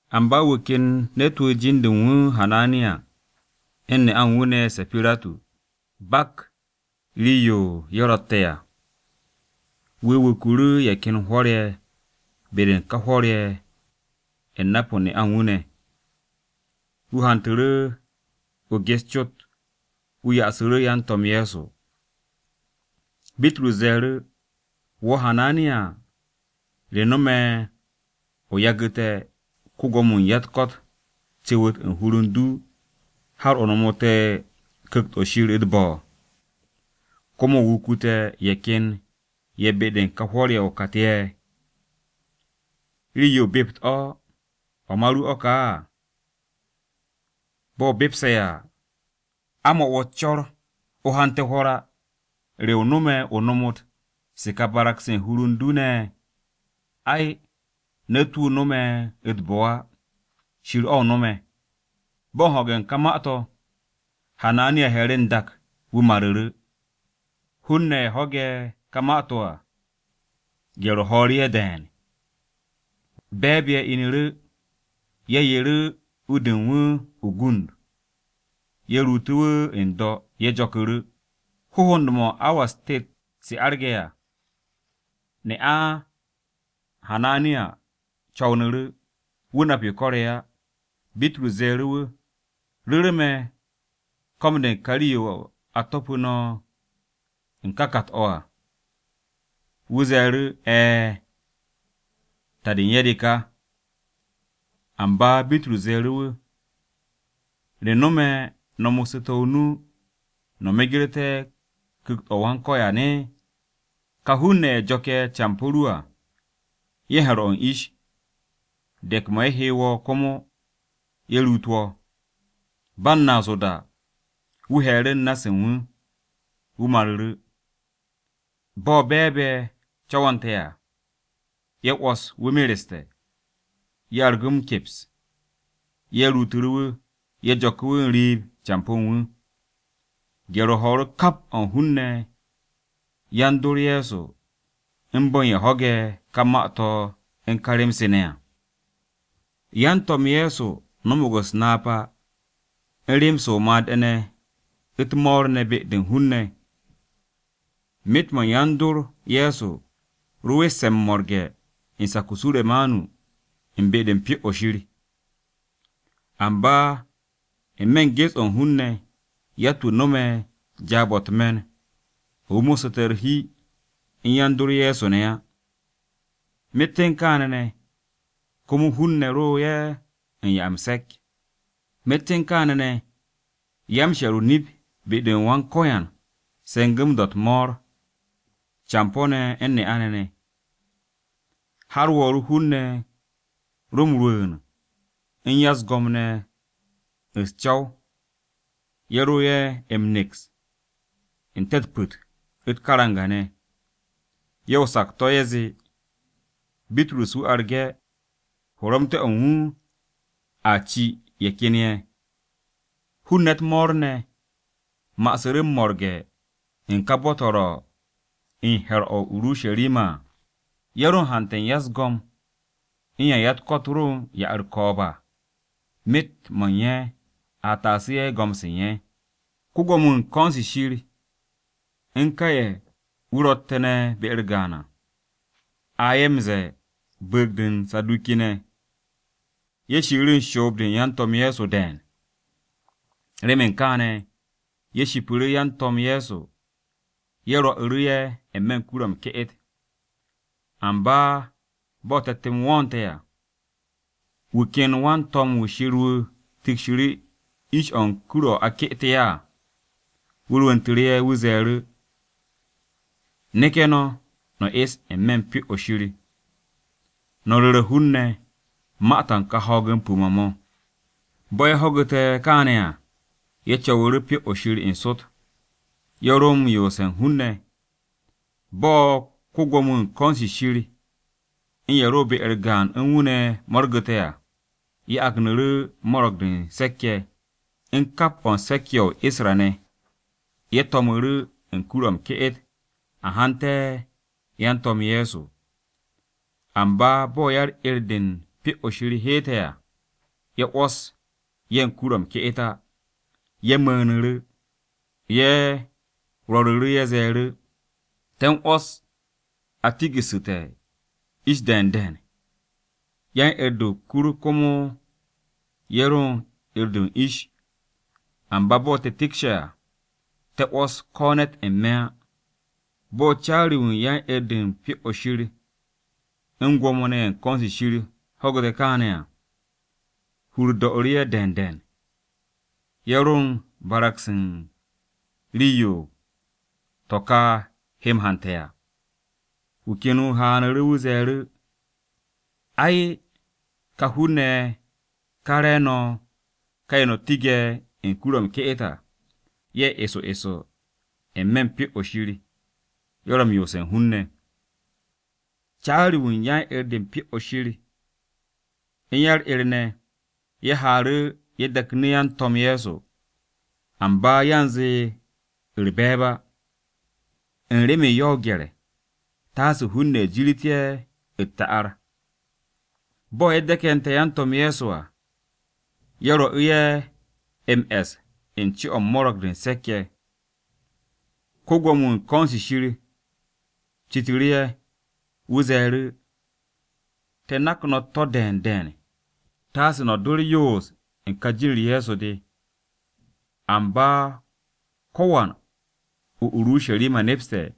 Amba wu̱ ken ne̱t-wu̱ jin-de u̱n wu̱ Hananiya u̱n ne'a u̱n wu̱ ne̱ Sapiratu, bak rii-yo ye̱ ro̱tte̱ à. Wu̱ wuku̱ru̱ ye̱ ken hwo̱r-ye̱ be-de u̱n ka hwo̱r-ye̱ u̱n nap-o ne'a u̱n wu̱ ne̱. Wu̱ hantu̱ru̱ o-gyes cot, wu̱ ya'asu̱ru̱ yan-To̱m Ye̱so. Bitrus ze̱e̱ru̱, “Wo̱ Hananiya, ¿re nome̱ o yagu̱te̱ ko-Gwo̱mo-wu̱ u̱n ya-u̱t-ko̱t cu̱wu̱t u̱n hur u̱n du, har o nomote̱ Ku̱kt-o̱ Shir u̱t-bo̱, komo o wukute̱ ye̱ ken ye̱ be-de u̱n ka hwo̱r-ye̱ o-kat ye̱? Rii-yo o bept o̱, ¿o̱ ma ru o̱ ka? Bo̱ o bepse̱ à, ¿a u̱n mo̱ wo̱ u̱s-co̱r o hante̱ hwo̱r? ¿Re o no̱me̱ o nomot se̱ ka barag-se u̱n hur u̱n du ne̱? Ay, ne̱t-wu̱ o nome̱ u̱t-bo̱ á, Shir-o̱ o nome̱.” Bo̱ u̱n ho̱ge̱ u̱n ka ma-to̱, Hananiya he̱e̱ru̱ n-dak, wu̱ maru̱ru̱. Hun-ne̱ ye̱ ho̱ge̱ ka ma-to̱ à, gye̱r-o ho̱o̱ru̱ ye̱ de̱e̱n. Be̱e̱b-ye̱ inu̱ru̱ ye̱ yeru̱ u-de u̱n wu̱ o-gund. Ye̱ ruutu̱ wu̱ n-do̱, ye̱ jo̱ku̱ru̱. Hohond-mo̱ u̱n awa-u̱s tet se arge̱ à, ne'a Hananiya co̱wnu̱ru̱. Wu̱ nap yo ko̱re̱ á. Bitrus ze̱e̱ru̱ wu̱, “¿Ru̱ru̱ me̱ ko̱m-de ka rii-yo a to̱pu̱ no̱ u̱n ká kat-o̱?” Wu̱ ze̱e̱ru̱, “E̱e̱, ta-de u̱n ye̱ de ka.” Amba Bitrus ze̱e̱ru̱ wu̱, “¿Re no̱me̱ no̱ mo̱ssu̱te̱ o-nu no̱ megerté̱ Ku̱kt-o̱ Wan-Ko̱yan? Ka hun-ne̱ ye̱ jo̱ke̱ campo̱ ru à, ye̱ u̱n he̱r-o̱ u̱n ish, de̱k-mo̱ ye̱ he wo̱ komo ye̱ ruut wo̱.” Ba u̱n naas o-da, wu̱ he̱e̱ru̱ u̱n na-se u̱n wu̱, wu̱ maru̱ru̱. Bo̱ be̱e̱b-ye̱ co̱wo̱nte̱ à, ye̱ 'wo̱s wu̱ mereste̱. Ye̱ argu̱ wu̱ m-keps, ye̱ ruutu̱ru̱ wu̱, ye̱ jo̱ku̱ wu̱ n-riib campo̱ u̱n wu̱. Gye̱r-o ho̱o̱ru̱ kap o̱ u̱n hun-ne̱ yan-dor Ye̱so u̱n bo̱ u̱n ye̱ ho̱ge̱ ka ma-to̱ u̱n ka rem-se ne̱ à. Yan-To̱m Ye̱so no̱mo̱g u̱s-napa u̱n rem-se o-made̱ ne̱ u̱t-mo̱o̱r ne̱ be-de u̱n hun-ne̱. Myet-mo̱ yan-dor Ye̱so ro we̱tse̱ m-mo̱rge̱ u̱n sak-o Suremanu u̱n be-de u̱n Pyo-o̱ Shir. Amba n-me̱ gyes-o̱ u̱n hun-ne̱, yatt-wu̱ no̱me̱ jaab-o̱ u̱t-me̱n o̱ wu̱ mossu̱te̱ u̱r-hi u̱n yan-dor Ye̱so ne̱ á. Myet u̱n kaane̱ ne̱, komo hun-ne̱ ro ye̱ u̱n 'ya m-se̱k. Myet u̱n kaane̱ ne̱, ya-m-she̱r o-nip be-de u̱n Wan-Ko̱yan ye̱ se̱ngu̱ m-do̱ u̱t-mo̱o̱r, campo̱-ne̱ u̱n ne'a-ne̱ ne̱. Har wo̱o̱ru̱ hun-ne̱ ro m-rwu̱u̱n u̱n ya-u̱s-go̱m ne̱ u̱s-co̱w, ye̱ ro ye̱ m-neks n-te̱ u̱t-pu̱t, u̱t-karanga ne̱. Ye̱ o-sakto̱ ye̱ zee Bitrus wu̱ arge̱, horomte̱-o̱ u̱n wu̱ a ci ye̱ ken ye̱. Hun-ne̱ u̱t-mo̱o̱r ne̱ ma'asu̱ru̱ m-mo̱rge̱ u̱n ka bo̱-to̱ ro u̱n he̱r-o̱ o-Urusharima à. Ye̱ ro u̱n hante̱ u̱n ya-u̱s-go̱m u̱n ye̱ ya-u̱t-ko̱t ro ne̱ u̱n ya-u̱r-ko̱o̱b à, myet-mo̱ u̱n ye̱, a taasu̱ ye̱ go̱m-se u̱n ye̱. Ko-Gwo̱mo-wu̱ u̱n ko̱n-se Shir u̱n ka ye̱ wu̱ ro̱tte̱ ne̱ be-u̱r gaan à, (a ye̱ m-ze̱e̱, bu̱u̱g-de u̱n Saduki-ne̱), ye̱ shiiru̱ u̱n shoob-de u̱n yan-To̱m Ye̱so de̱e̱n. Remen kaane̱, ye̱ shipu̱ru̱ yan-To̱m Ye̱so, ye̱ rwo̱'u̱ru̱ ye̱ n-me̱ u̱n kur-o m-ke'et. Amba bo̱ te̱t-m wo̱o̱nte̱ à, wu̱ ken wan-to̱m-wu̱ Wan-Ko̱yan wu̱ tikshiru̱ ish-o u̱n kur-o̱ a ke'ete̱ ye̱ à. Wu̱ rwu̱ntu̱ ye̱, wu̱ ze̱e̱ru̱, “Neke̱ no̱, no̱ es n-me̱ u̱n Pyo-o̱ Shir no̱ ru̱re̱ hun-ne̱ ma-to̱ u̱n kà ho̱o̱g-m pu̱-mo̱ mo̱.” Bo̱ ye̱ ho̱gu̱te̱ kaane̱ à, ye̱ co̱wu̱ru̱ Pyo-o̱ Shir n-sot, ye̱ ro̱ m-yoose̱ u̱n hun-ne̱. Bo̱ ko-Gwo̱mo-wu̱ u̱n ko̱n-se Shir u̱n ye̱ ro̱ be-u̱r gaan u̱n wu̱ ne̱ mo̱rgu̱te̱ à, ye̱ agnu̱ru̱ Mo̱ro̱g-de u̱n Se̱k-ye̱, u̱n kap o̱ u̱n se̱k-ye̱ ye̱ o-Isra-ne̱, ye̱ to̱mu̱ru̱ u̱n kur-o̱ m-ke'et a haante̱ yan-To̱m Ye̱so. Amba bo̱ yan-'er-de u̱n Pyo-o̱ Shir heete̱ à, ye̱ 'wo̱s ye̱ u̱n kur-o̱ m-ke'et á. Ye̱ mu̱u̱nu̱ru̱. Ye̱ rwo̱ru̱ru̱, ye̱ ze̱e̱ru̱, “Te̱ u̱n 'wo̱s a tigu̱su̱te̱ ish de̱e̱n de̱e̱n, yan-'er-de o-kur komo ye̱ ro u̱n 'er-de u̱s-ish. Amba bo̱ te̱ tikshe̱ à, te̱ 'wo̱s ko̱ ne̱t n-me̱ á.” Bo̱ caari-wu̱ u̱n yan-'er-de u̱n Pyo-o̱ Shir u̱n Gwo̱mo-ne̱ ye̱ u̱n ko̱n-se Shir ne̱ ho̱gu̱te̱ kaane̱ à, hur-u̱r do̱'u̱ru̱ ye̱ de̱e̱n. Ye̱ ro u̱n barag-se u̱n rii-yo to̱ ka he m-hante̱ à. Wu̱ ken wu̱ haanu̱ru̱, wu̱ ze̱e̱ru̱ ye̱, “Ai, ka hun-ne̱ ye̱ ka re̱e̱no̱ ka ye̱ no̱ tige̱ u̱n kur-o̱ m-ke'et à, ye̱ eso eso n-me̱ u̱n Pyo-o̱ Shir, ye̱ ro̱ m-yoose̱ u̱n hun-ne̱.” Caari-wu̱ u̱n yan-'er-de u̱n Pyo-o̱ Shir u̱n ya-u̱r-'er ne̱, ye̱ haaru̱ ye̱ de̱knu̱ yan-To̱m Ye̱so, amba yanze u̱r-be̱e̱b á, u̱n remen ye̱ ro o-gye̱r taase hun-ne̱ jir ye̱ u̱t-ta'ar. Bo̱ ye̱ de̱ke̱nte̱ yan-To̱m Ye̱so à, ye̱ rwo̱'u̱ ye̱ m-e̱s u̱n co-o̱ u̱n Mo̱ro̱g-de u̱n Se̱k-ye̱. Ko-Gwo̱mo-wu̱ u̱n ko̱n-se Shir citu̱ru̱ ye̱. Wu̱ ze̱e̱ru̱, “Te̱ nak no̱ u̱t-to̱ de̱e̱n de̱e̱n taase no̱ do u̱r-yoos u̱n ka jin-u̱r Ye̱so de. Amba ko̱wan o-Urusharima nepste̱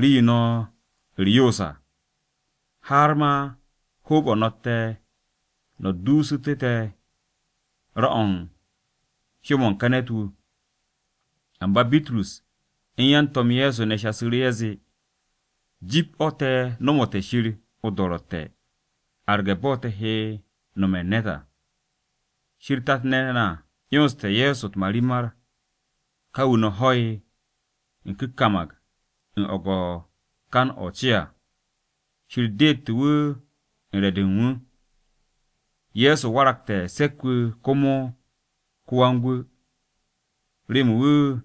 rii-yo no̱ u̱r-yoos à, har ma hoob-o̱ no̱tte̱ no̱ duusu̱tu̱ te̱ ra-o̱ u̱n hyó-mo̱ u̱n ka ne̱t-wu̱.” Amba Bitrus u̱n yan-To̱m Ye̱so ne̱ shasu̱ru̱, ye̱ zee, “Jip o̱ te̱ nomote̱ Shir o-do̱ro̱tte̱ arge̱ bo̱ te̱ he nome̱ u̱n ne̱t à! Shir tat-ne̱ na 'yonste̱ Ye̱so u̱t-marimar, ka wu̱ no̱ ho̱'e̱ ku̱nkam u̱n o̱go̱-kan o-ce à. Shir deete̱ wu̱ u̱n re̱-de u̱n wu̱, Ye̱so waragte̱ Se̱k-wu̱ komo ko-Wan-Gwu̱, remen wu̱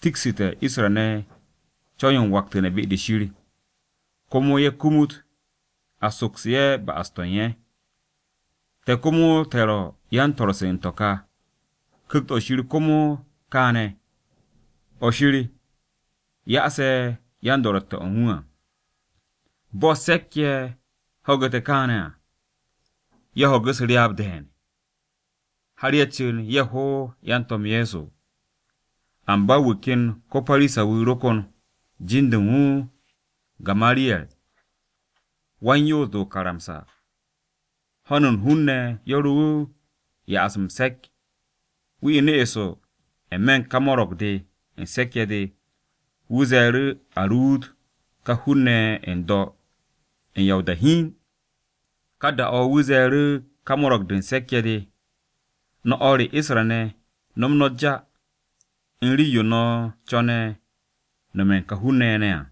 tiksu̱té̱ Isra-ne̱ co̱w-yo m-waktu̱ne̱ be-de Shir, komo ye̱ kumut a soksu̱ ye̱ ba'as-to̱ u̱n ye̱. Te̱ komo te̱ ro̱ yan-swo̱-se u̱n to̱ ka, Ku̱kt-o̱ Shir komo kaane̱, o̱ Shir ya'ase̱ yan-do̱ro̱tte̱-o̱ u̱n wu̱ à.” Bo̱ se̱k-ye̱ ho̱gu̱te̱ kaane̱ à, ye̱ ho̱gu̱ u̱s-ryaab de̱e̱n, har ye̱ cu̱n ye̱ ho yan-To̱m Ye̱so. Amba wu̱ ken ko-Parisa-wu̱ ro kon. Jin-de u̱n wu̱ Gamariyer. Wan-Yoos-de o-karamsa, ho̱n u̱n hun-ne̱ ye̱ ro wu̱ u̱n ya'as m-se̱k. Wu̱ inu̱ eso n-me̱ u̱n ka Mo̱ro̱g-de u̱n Se̱k-ye̱ de, wu̱ ze̱e̱ru̱ a ruut ka hun-ne̱ ye̱ n-do̱ u̱n ya o-da hiin. Ka da-o̱ wu̱ ze̱e̱ru̱ ka Mo̱ro̱g-de u̱n Se̱k-ye̱ de, “No̱ o̱r re Isra-ne̱, no̱m no̱ ja u̱n rii-yo no̱ co̱ne̱ nome̱ u̱n ka hun-ne̱ ye̱ à.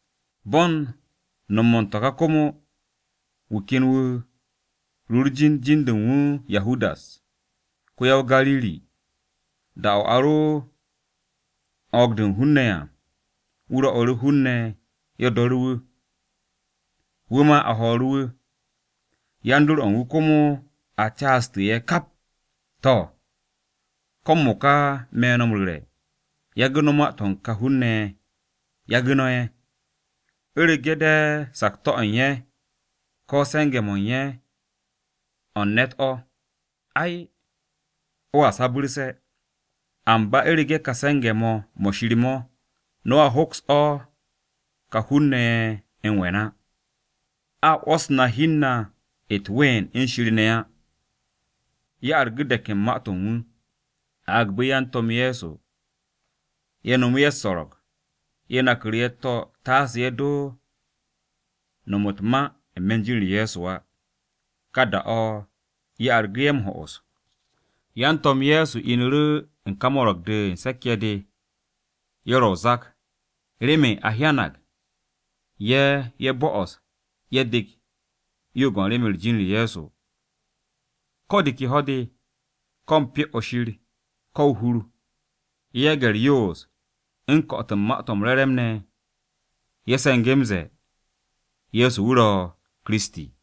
Bo̱ u̱n nom u̱n to̱ ka komo, wu̱ ken wu̱ ru u̱r-jin, jin-de u̱n wu̱ Yahudas, ko-ya-o-Gariri. Da-o̱ a ro u̱n o̱o̱g-de u̱n hun-ne̱ à, wu̱ rwo̱'u̱ru̱ hun-ne̱ ye̱ do̱ru̱ wu̱. Wu̱ ma a ho̱o̱ru̱ wu̱, yan-dor-o̱ u̱n wu̱ komo a caastu̱ ye̱ kap. To̱, ko̱ m-mo̱ka me̱ no̱ m-ru̱re̱, yagu̱ no̱ ma-to̱ u̱n ka hun-ne̱ ye̱, yagu̱ no̱ ye̱. U̱rege̱ de̱ sakto̱-o̱ u̱n ye̱, ko̱ se̱nge̱-mo̱ u̱n ye̱ mo̱ u̱n ne̱t o̱, ai, mo̱a sabu̱rse̱. Amba u̱rege̱ ka se̱nge̱-mo̱ mo̱ Shir mo̱, no̱a hoks mo̱, ka hun-ne̱ ye̱ m-we̱n á. A 'wo̱s na hi u̱n na u̱t-ween u̱n Shir ne̱ á!” Ye̱ argu̱ de̱k u̱n ma-to̱ u̱n wu̱. Ye̱ agbu̱ yan-To̱m Ye̱so ye̱ nomu̱ ye̱ u̱s-so̱ro̱g. Ye̱ naku̱ru̱ ye̱ u̱t-to̱ taase ye̱ do no̱m u̱t-ma n-me̱ u̱n jin-u̱r Ye̱so á. Ka da-o̱ ye̱ argu̱ ye̱ m-ho'os. Yan-To̱m Ye̱so inu̱ru̱ u̱n ka Mo̱ro̱g-de u̱n Se̱k-ye̱ de, ye̱ ro̱ o-zak remen a hyanag ye̱, ye̱ bo̱'o̱se̱ ye̱ dek o-yo'og u̱n remen u̱n jin-u̱r Ye̱so. Ko̱ de ke ho̱-de, ko̱ u̱n Pyo-o̱ Shir, ko̱ o-hur, ye̱ yage̱ u̱r-yoos u̱n ko̱'o̱t u̱n Ma-to̱ m-Re̱re̱m ne̱ á. Ye̱ se̱nge̱ m-ze̱e̱ Ye̱so wu̱ ro̱ Kiristi.